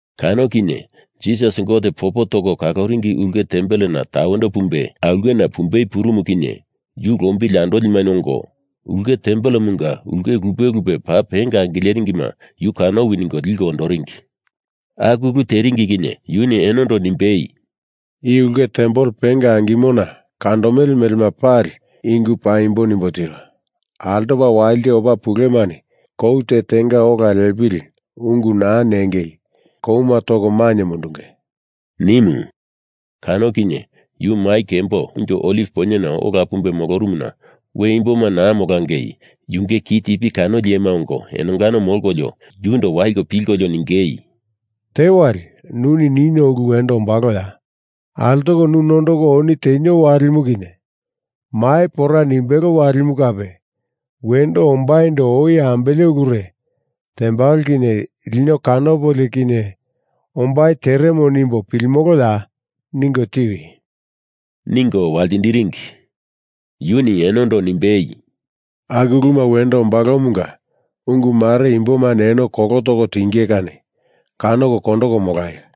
Kano kinye Jisas Gote popo toko kaloringi ulke tempelena tawendo pumbe aulkena pumbei purumu kinye yu lombili andolima ongo ulke tempelemunga ulke lupe lupe paa penga angileringima yu kanowi ningo liko ondoringi. Aku ulu teringi kinye yuni enondo nimbei, “I ulke tempel penga angimona kandomele melema pali i ungu paimbo nimbo tiro. Altopa walite opa pulemani kou te tenga ola lepili ungu naa ningei kouma toko mainye mundunge,” nimu. Kano kinye yu mai kembo Unjo Oliv Poinyena ola pumbe molorumuna we imboma naa molangei yunge kitipi kanoli iyema ongo enongano molkolio yundo waliko pilkolio ningei, “Tewali nuni nino ulu wendo ombaloya? Altoko nu nondoko oni tenio walimu kinye mai pora nimbelo walimu kape wendo ombaindo oi ambele ulure tembalo kinye lino kanopolio kinye ombai teremo nimbo pilimoloya? Ningo tiwi,” ningo waltindiringi. Yuni enondo nimbei, “Aku uluma wendo ombalomunga ungu mare imbomani eno kolo toko tinge kani kanoko kondoko molaio.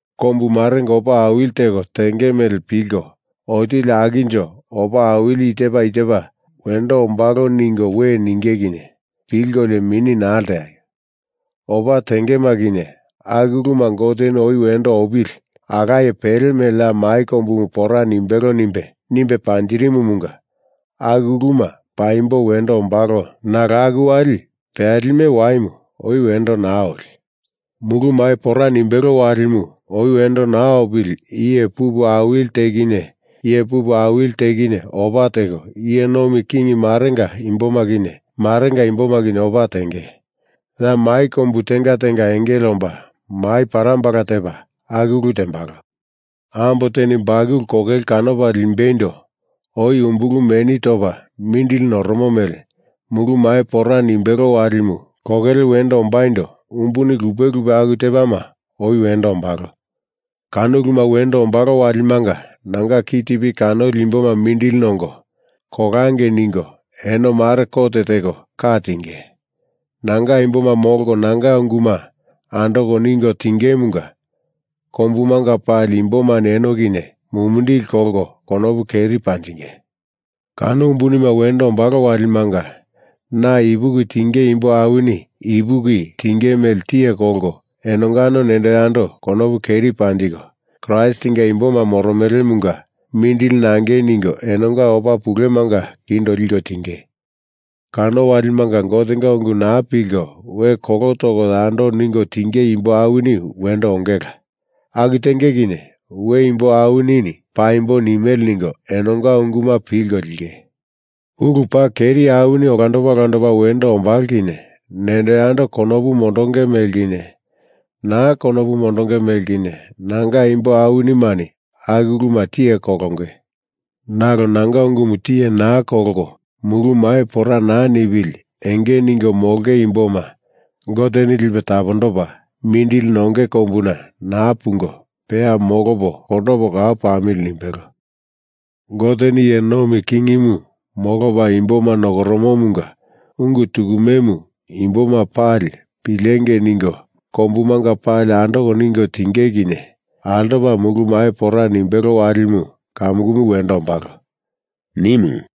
Kombu marenga opa awili teko tenge mele pilko, otili akinjo opa awili i tepa i tepa wendo ombalo ningo we ninge kinye pilkolio mini naa lteaio. Opa tengema kinye aku uluma Goteni oi wendo opili, alaye pele mele ya mai kombumu pora nimbelo nimbe, nimbe panjirimumunga aku uluma paimbo wendo ombalo nalo aku wali peyalime waimu oi wendo naa oli. Mulu mai pora nimbelo walimu oi wendo naa opili iye pupu awili te kinye iye pupu awili te kinye opa teko, iye nomi king marenga imboma kinye marenga imboma kinye opa tenge. Ya mai kombu tenga tenga engele omba, mai parambala tepa, aku ulu tembalo. Ambo teni bakulu kokele kanopa limbeindo oi umbulu meni topa mindili noromo mele, mulu mai pora nimbelo walimu kokele wendo ombaindo umbuni lupe lupe aku tepama oi wendo ombalo. Kano uluma wendo ombalo walimanga nanga kitipi kanoli imboma mindili nongo, kolangei ningo eno mare kot teko ka tinge. Nanga imboma molko nanga unguma andoko ningo tingemunga kombumanga pali imbomani eno kinye mumindili kolko konopu keri panjinge. Kano umbunima wendo ombalo walimanga na ipuki tinge imbo awini ipuki tinge mele tiye kolko enongano nendo yando konopu keri panjiko, Kraistinga imboma moromelemunga mindili nangei ningo enonga opa pulemanga kindo liko tinge. Kano walimanga Gotenga ungu naa pilko we kolo toko yando ningo tinge imbo awini wendo ongela. Aku tenge kinye we imbo awinini paimbo nimele ningo enonga unguma pilko linge. Ulu paa keri awini olandopa olandopa wendo ombalo kinye nendo yando konopu mondonge mele kinye, na konopu mondonge mele kinye nanga imbo awinimani aku uluma tiye kolonge. Nalo nanga ungumu tiye naa kolko mulu mai pora naa nipili enge ningo molonge imboma Goteni lipe tapondopa mindili nonge kombuna naa pungo peya molopo kondopo kau pamili nimbelo. Goteni iye nomi kingimu molopa imboma nokoromomunga ungu tukumemu imboma pali pilengei ningo kombumanga pali andoko ningo tinge kinye altopa mulu mai pora nimbelo walimu kamukumu wendo ombalo,” nimu.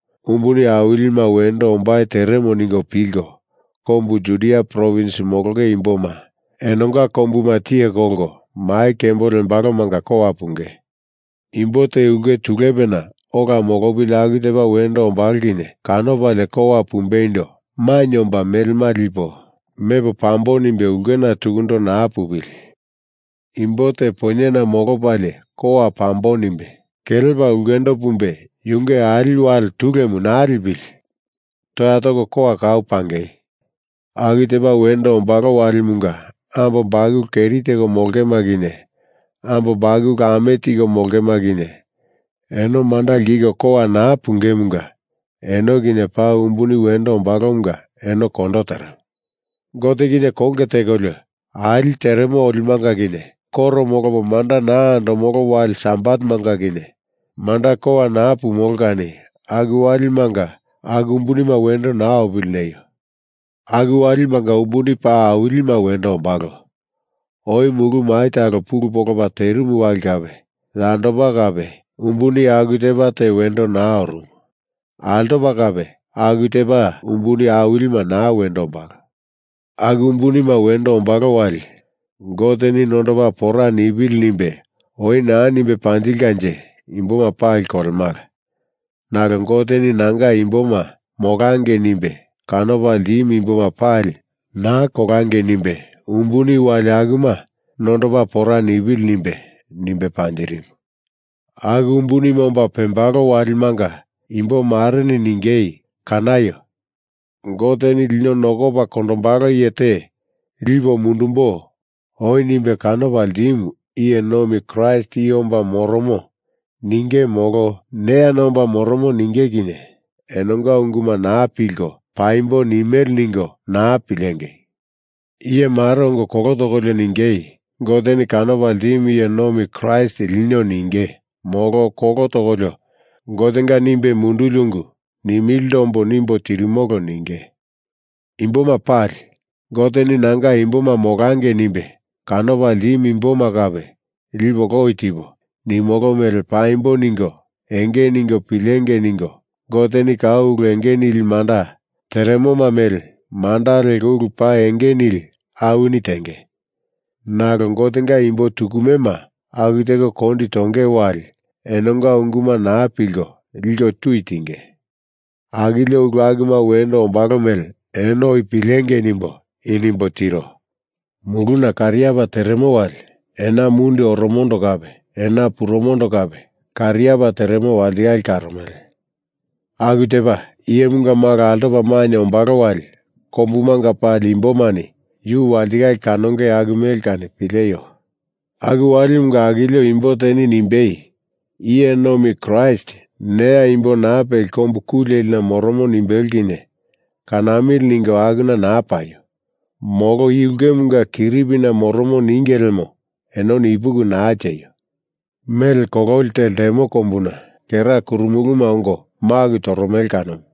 umbuni awilima wendo ombai teremo ningo pilko kombu Judia provins molonge imboma enonga kombuma tiye kolko mai kembo lembalomanga kowa pungei. Imbo te ulke tulepena ola molopili aku tepa wendo ombalo kinye kanopalie kowa pumbeindo mainye omba melema lipo mepo pambo nimbe ulkena tukundo naa pupili. Imbo te poinyena molopalie kowa pambo nimbe kelepa ulkendo pumbe yunge ali wale tulemu naa lipili. Toya toko kowa kau pangei. Aku tepa wendo ombalo walimunga ambo bakulu keri teko molongema kinye, ambo bakulu ame tiko molongema kinye, eno manda lkiko kowa naa pungemunga eno kinye paa umbuni wendo ombalomunga eno kondo teremo. Gote kinye konge tekolio, ali teremo olimanga kinye koro molopo manda naa andomolo wali Sabatemanga kinye manda kowa naa pumolo kani aku walimanga aku umbunima wendo naa opili neio. Aku walimanga umbuni paa awilima wendo ombalo. Oi mulu mai talo pulu polopa terimu wali kape, yandopa kape umbuni aku tepa te wendo naa orumu. Altopa kape aku tepa umbuni awilima naa wendo ombalo. Aku umbunima wendo ombalo wali Goteni nondopa pora nipili nimbe oi naa nimbe panjilkanje imboma pali kolemala. Nalo Goteni nanga imboma molangei nimbe kanopa ltimu imboma pali naa kolangei nimbe umbuni wali akuma nondopa pora nipili nimbe, nimbe panjirimu. Aku umbunima omba pembalo walimanga imbo mareni ningei, ‘Kanaio! Goteni lino nokopa kondombalo iye te lipo mundumbo oi nimbe kanopa ltimu iye nomi Kraist i omba moromo,’ ninge molo ‘Neyana omba moromo,’ ninge kinye enonga unguma naa pilko, paimbo nimele ningo naa pilengei! Iye mare ongo kolo tokolio ningei, ‘Goteni kanopa ltimu iye nomi Kraist lino,’ ninge, molo kolo tokolio ‘Gotenga nimbe munduli ungu nimilindo ombo nimbo tirimolo,’ ninge. Imboma pali, Goteni nanga imboma molangei nimbe kanopa ltimu imboma kape lipo loi tipo, nimolo mele paimbo ningo enge ningo pilengei ningo Goteni kau ulu enge nili manda teremoma mele manda leko ulu paa enge nili awini tenge. Nalo Gotenga imbo tukumema aku teko kondi tonge wali enonga unguma naa pilko, liko tui tinge. Akilio ulu akuma wendo ombalo mele eno oi pilengei nimbo i nimbo tiro. Muluna kariapa teremo wali ena mundi oromondo kape ena pepurumondo kape kariapa teremo walitikale karomele, aku tepa Iyemunga Malo altopa mainye ombalo wali kombumanga pali imbomani yu walitikale kanonge aku mele kani pileio. Aku walimunga akilio imbo teni nimbei, ‘Iye nomi Kraist neya imbo naa peli kombu ku lelina moromo,’ nimbelo kinye kanamili ningo akuna naa paio. Molo i ulkemunga kiripina moromo ninge lemo enoni ipuki naa tieio! Mele kololi te lemo kombuna kera kurumuluma ongo maku toromele kanomu.”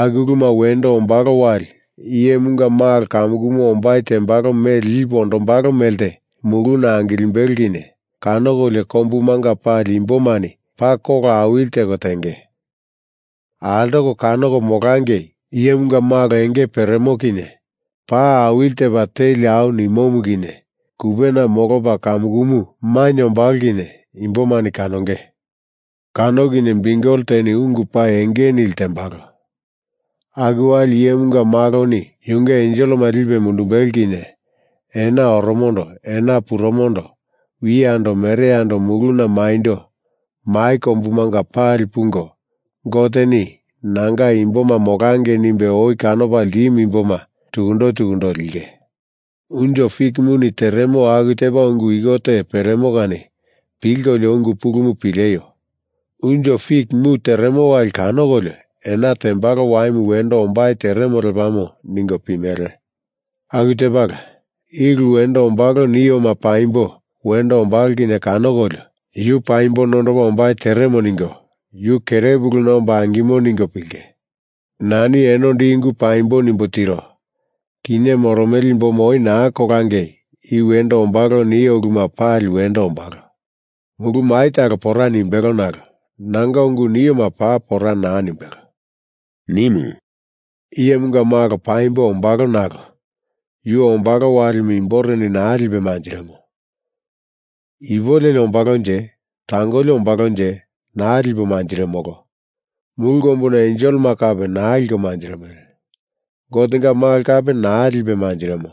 Aku uluma wendo ombalo wali Iyemunga Malo kamukumu ombai tembalo mele lipe ondombalo melte muluna angilimbelo kinye kanokolio kombumanga pali imbomani paa kola awili teko tenge. Altoko kanoko molangei Iyemunga Malo enge peremo kinye, pa awili tepa teli au nimomu kinye kupena molopa kamukumu mainye ombalo kinye imbomani kanonge. Kano kinye biukel teni ungu paa enge nili tembalo. Aku wali Iyemunga Maloni yunge enselema lipe mundumbelo kinye ena oromondo ena pepurumondo wiyando mereyando muluna maindo mai kombumanga pali pungo Goteni nanga imboma molangei nimbe oi kanopa ltimu imboma tukundo tukundo linge.” “Unjo fikimuni teremo aku tepa ungu iko te peremo kani pilkolio ungu pulumu pileio. Unjo fik mu teremo wali kanokolio ena tembalo waimu wendo ombai teremo lepamo ningo pimele. Aku tepala, i ulu wendo ombalo nioma paimbo wendo ombalo kinye kanokolio Yu paimbo nondopa ombai teremo ningo Yu kerepuluna omba angimo ningo pilinge. Nani enondo i ungu paimbo nimbo tiro. Kinye moromele imboma oi naa kolangei i wendo ombalo nio uluma pali wendo ombalo. Mulu mai talo pora nimbelo nalo nanga ungu nioma paa pora naa nimbelo,” nimu. “Iyemunga Malo paimbo ombalo nalo yu ombalo walimu imboreni naa lipe manjirimo. Ipu leli ombalonje, tangoli ombalonje naa lipo manjirimolo. Mulu kombuna enselema kape naa liko manjirimele. Gotenga Malo kape naa lipe manjirimo.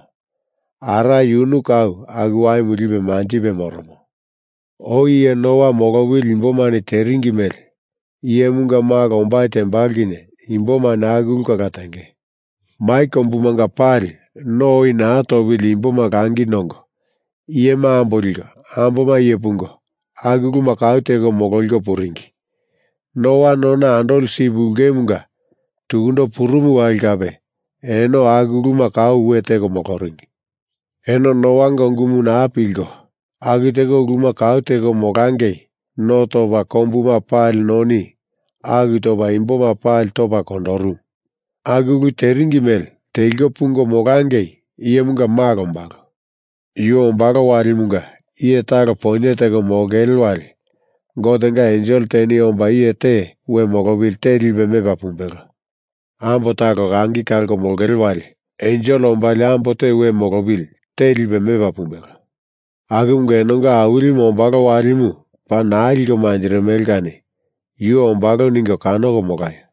Ara yunu kau aku waimu lipe manjipe moromo. Oi iye Noa molopili imbomani teringi mele Iyemunga Malo ombai tembalo kinye imbomani aku ulu kala tenge. Mai kombumanga pali no oi naa topili imboma langi nongo, iyema ambo liko, amboma iye pungo, aku uluma kau teko mololiko puringi. Noa nona andoli sip ulkemunga tukundo purumu wali kape eno aku uluma kau we teko moloringi. Eno Noanga ungumu naa pilko aku teko uluma kau teko molangei no topa kombuma pali noni aku topa imboma pali topa kondorumu. Aku ulu teringi mele teliko pungo molangei Iyemunga Malo ombalo. Yu ombalo walimunga iye talo poinye teko molongele wali Gotenga ensel teni omba iye te we molopili te lipe mepa pumbelo. Ambo talo langi kalko molongele wali ensel ombalie ambo te we molopili te lipe mepa pumbelo. Akumunga enonga Awilimu ombalo walimu paa naa liko manjirimele kani Yu ombalo ningo kanoko molaio.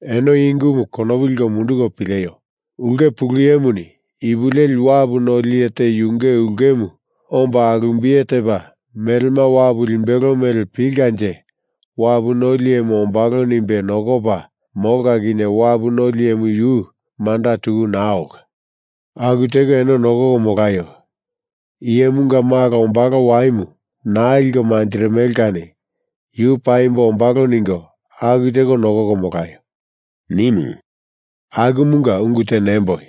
Eno i ungumu konopu liko munduko pileio. Ulke pulu iyemuni ipu leli wapu noli iye te yunge ulkemu omba alumbiye tepa melema wapu limbelo mele pilkanje wapu noli iyemu ombalo nimbe nokopa molka kinye wapu noli iyemu yu manda tuku naa olka. Aku teko eno nokoko molaio. Iyemunga Malo ombalo waimu naa liko manjirimele kani yu paimbo ombalo ningo aku teko nokoko molaio,” nimu. “Akumunga ungu te nemboi,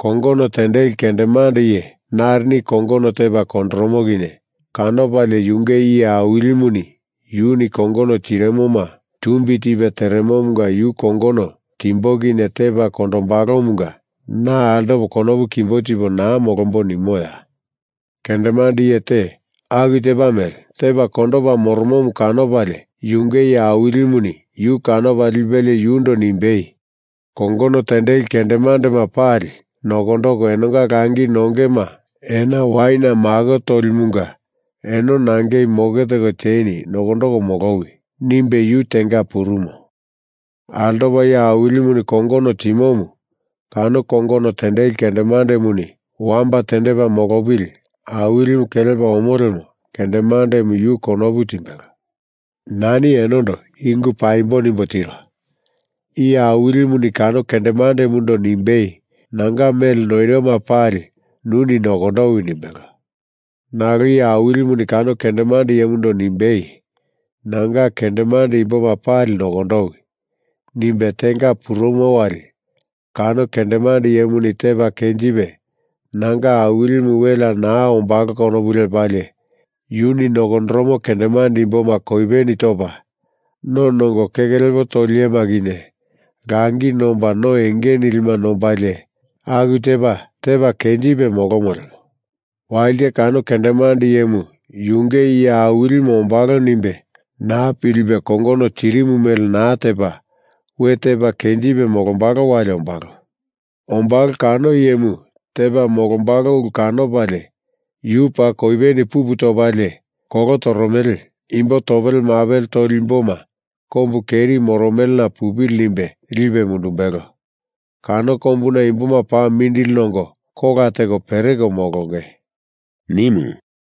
kongono tendeli kendemande iye narini kongono tepa kondoromo kinye kanopalie yunge iye awilimuni yuni kongono tiroma tumbi tipe teremomunga yu kongono timbo kinye tepa kondombalomunga na altopo konopu kimbo tipo naa molombo nimoya? Kendemande iye te aku tepa mele tepa kondopa moromomu kanopalie yunge iye awilimuni yu kanopa lipelie yundo nimbei, ‘Kongono tendeli kendemandema pali nokondoko enonga langi nongema ena waina mako tolimunga eno nangei moke teko tieni, nokondoko molowi,’ nimbe yu tenga purumo. Altopa iye awilimuni kongono timomu kano kongono tendeli kendemandemuni wamba tendepa molopili awilimu kelepa omo lemo kendemandemu yu konopu timbelo. Nani enondo i ungu paimbo nimbo tiro. Iye awilimuni kano kendemandemundo nimbei, ‘Nanga mele noiroma pali nuni nokondowi,’ nimbelo. Nalo iye awilimuni kano kendemande iyemundo nimbei, ‘Nanga kendemande imboma pali nokondowi,’ nimbe tenga purumo wali kano kendemande iyemuni tepa kenjipe nanga awilimu welea naa ombalo konopu lepalie yuni nokondoromo kendemande imboma koipeni topa, no nongo keke lepo toli iyema kinye langi nomba no enge nilima nombalie, aku tepa tepa kenjipe molomo lemo walite kano kendemande iyemu yunge iye awilimu ombalo nimbe naa pilipe kongono tirimu mele naa tepa we tepa kenjipe molombalo wali ombalo. Ombalo kano iyemu tepa molombalo ulu kanopalie yu paa koipeni pupu topalie, kolo toromele imbo topele mapele toli imboma kombu keri moromelena pupili nimbe lipe mundumbelo. Kano kombuna imboma paa mindili nongo kola teko pereko molonge,” nimu.